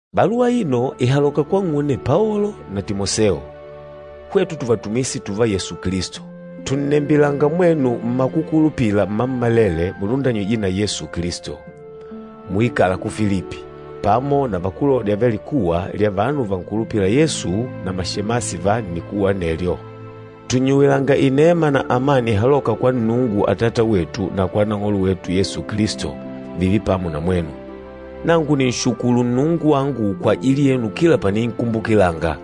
Baluwa aino ìhaloka kwang'une Paolo na Timoseo, hwetu tuvatumishi tùvá Yesu Kilisto. Tùnnembilanga mwenu mmakukulupila mmammalele mulundanyîjwe na Yesu Kilisto, muikâla ku Filipi, pamo na vakulôdya va likuwa lya vanu vankulupîla Yesu na mashemasi va nnikuwa anelyo. Tùnnyuwilanga inema na amani ihalôka kwa Nnungu Atata wetu na kwa Nang'olo wetu Yesu Kilisto, vììve pamo na mwenu. Nangu nìnshukulu Nnungu wangu kwajili yenu kila paninkumbukilanga.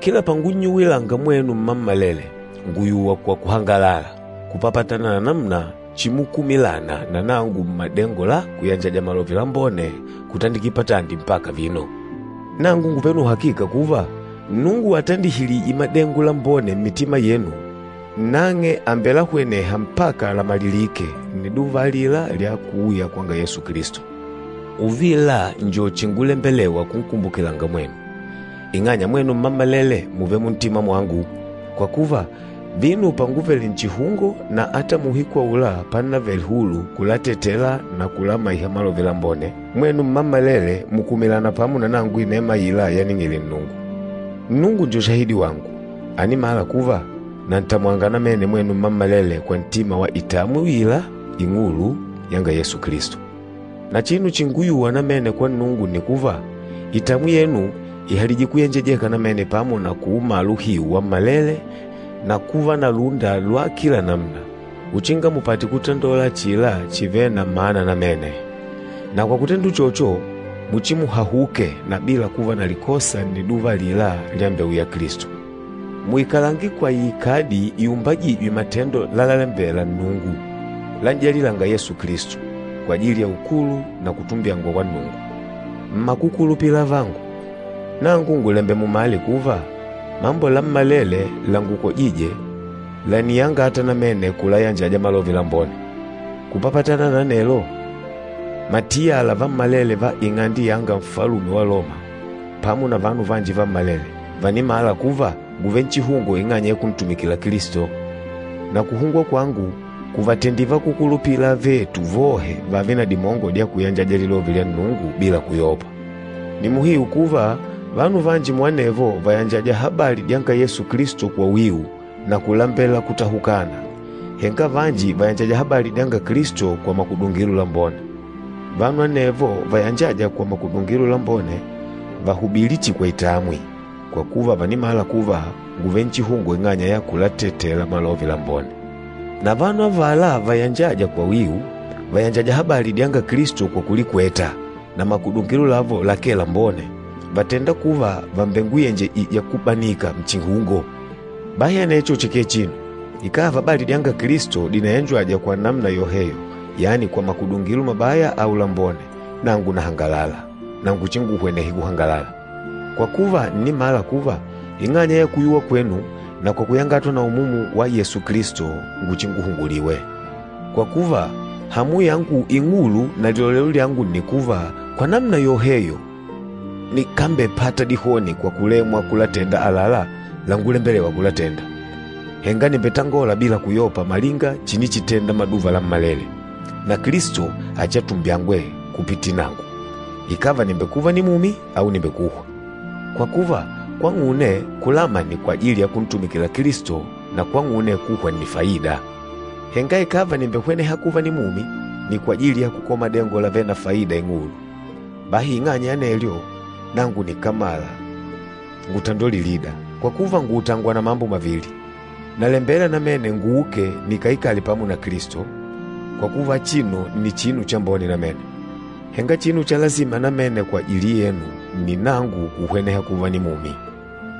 Kila pangunnyuwilanga mwenu mmammalele, ngùyuwa kwa kuhangalala, kupapatana na namuna chimukumilana na nangu mmadengo la kuyanjaja Malove Lambone kutandikila patandi mpaka vino. Nangu ngùvele na uhakika kuva, Nnungu atandilihîje madengo lambone mmitima yenu, nang'e àmbelahweneha mpaka lamalilìkè, nniduva alila lya kuuya kwanga Yesu Kilisto. Uvila njo chingulembelewa kunkumbukilanga mwenu, ing'anya mwenu mmammalele mùvele muntima mwangu. Kwa kuva, vino panguvele nchihungo na ata muuhiku aula pannavele hulu kulatetela na kulamaiha Malove Lambone, mwenu mmammalele mùkumilana pamo na nangu inema aila yaning'ile Nnungu. Nnungu njo shahidi wangu, ànimala kuva, nantamwanga namene mwenu mmammalele kwa ntima wa itamwi uila ing'ulu yanga Yesu Kilisto. Na chinu chínguyùwà namene kwa Nnungu nni kuva, itamwi yenu ihalije kuyenjejeka namene pamo na kuumala uhiu wammalele na kuva na lúnda lwa kila namuna, uchinga mupate kutandola achila chivêle na mana namene. Na kwa kutenda uchocho, muchimuhahuke na bila kuva na likosa nniduva alila lyambeuya Kilisto. Muikalange kwa iikadi iumbajîjwe matendo lalalembela Nnungu, lan'jalilânga Yesu Kilisto, kwajili ya ukulu na kutumbyangwa kwa Nnungu. Mmakukulupila avangu, nangu ngùlembela mumale kuva, mambo lammalele langukojîje làniyangata namene kulayanjaja Malove Lambone. Kupapatana na anelo, matiyala vammalele va ing'ande yanga Nfalume wa Loma, pamo na vanu vanji vammalele, vànimala kuva ngùvele nchihungo ing'anya ya kuntumikila Kilisto. Na kuhungwa kwangu, kùvatendile vakúkulupila avetu vohe vààve na dimongo dya kuyanjaja Lilove lya Nnungu bila kuyopa. Nni muhiu kuva, vanu vanji muanevo vàyanjaja habali dyanga Yesu Kilisto kwa wiu na kulambela kutahukana, henga vanji vàyanjaja habali dyanga Kilisto kwa makudungilo lambone. Vanu anevo vayanjâja kwa makudungilo lambone, vàhubilí chihi kwa itamwi, kwa kuva vànimala kuva, ngùvele nchihungo ing'anya ya kulatetela Malove Lambone. Na vanu avala vayanjâja kwa wiu, vàyanjaja habali dyanga Kilisto kwa kulikweta, na makudungilo lavo lakee lambone, vàtenda kuva vàmbenguyenjejija kubanika nchihungo. Bahi anecho chikee chinu! Ikàva habali dyanga Kilisto dìnayanjajwa kwa namuna yoheyo, yani kwa makudungilo mabaya au lambone, nangu nahangalala, na nguchinguhwenehe kuhangalala. Kwa kuva, ǹnimala kuva, ing'anya ya kuyuwa kwenu, na kwa kuyangatwa na Umumu wa Yesu Kilisto, nguchinguhunguliwe. Kwa kuva, hamu yangu ing'ulu na lilolelo lyangu nni kuva, kwa namuna yoheyo nikambepata dihoni kwa kulemwa kulatenda àlalá langulembelewa kulatenda. Henga nimbetangola bila kuyopa malinga chinichitenda maduva lammalele. Na Kilisto achiatumbyangwe kupitila nangu, ikàva nìmbekuva nimumi au nìmbekuhwa. Kwa kuva, kwang'une, kulama nni kwajili ya kuntumikila Kilisto, na kwang'une, kuhwa nni faida. Henga ikàva nìmbehweneha kuva nimumi, nni kwajili ya kukola madengo lavêle na faida ing'ulu. Bahi ing'anya ya anelyo, nangu nikámala ngutandole lilida, kwa kuva, ngùutangwa na mambo mavili. Nalembela namene nguuke nikaikale pamo na Kilisto, kwa kuva achino nni chinu chambone namene. Henga chinu cha lasima namene kwajili yenu, nni nangu kuhweneha kuva nimumi.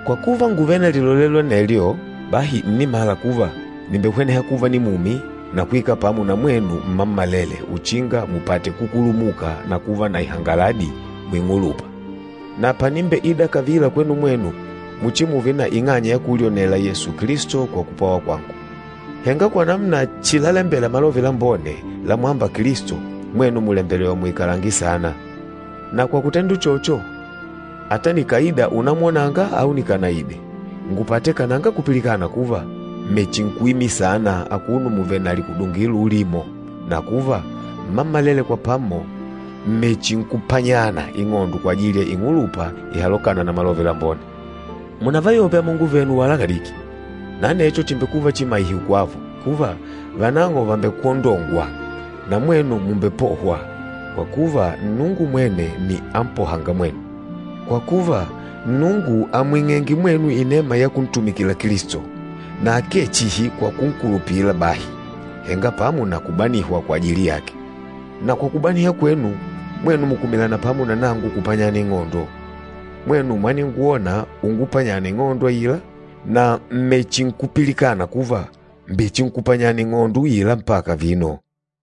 Kwa kuva, ngùvele na lilolelo anelyo, bahi ǹnimala kuva, nìmbehweneha kuva nimumi na kuikala pamo na mwenu mmammalele uchinga mupate kukulumuka na kuva na ihangaladi muing'ulupa. Na panimbeida kavila kwenu mwenu, muchimuve na ing'anya ya kulyonela Yesu Kilisto kwa kupwawa kwangu. Henga kwa namuna chilalembela Malove Lambone lamwâmba Kilisto, mwenu mùlembelewa muikalange saana. Na kwa kutenda uchocho, ata nikàida unamwonanga au nikanaide, ngupate kananga kupilikana kuva, mmechinkuimila saana akuno muvèlè na likudungilo ulimo, na kuva, mmammalele kwa pamo mmechinkupanyana ing'ondo kwajili ya ing'ulupa ihalokâna na Malove Lambone. Munavayope amongo venu wala kadiki. Na anecho chìmbekuva chimaiho kwavo, kuva, vanang'o vàmbekwondongwa, na mwenu mùmbepohwa, kwa kuva, Nnungu mwene nni ampohânga mwenu. Kwa kuva, Nnungu àmwing'enge mwenu inema ya kuntumikila Kilisto, na akee chihi kwa kunkulupila bahi, henga pamo na kubanihwa kwajili yake. Na kwa kubanihwa kwenu, mwenu mùkumilana pamo na nangu kupanyana ing'ondo. Mwenu mwaningwona ungupanyana ing'ondo aila, na m̀mechinkupilikana kuva, mbèchinkupanyana ing'ondo uila mpaka vino.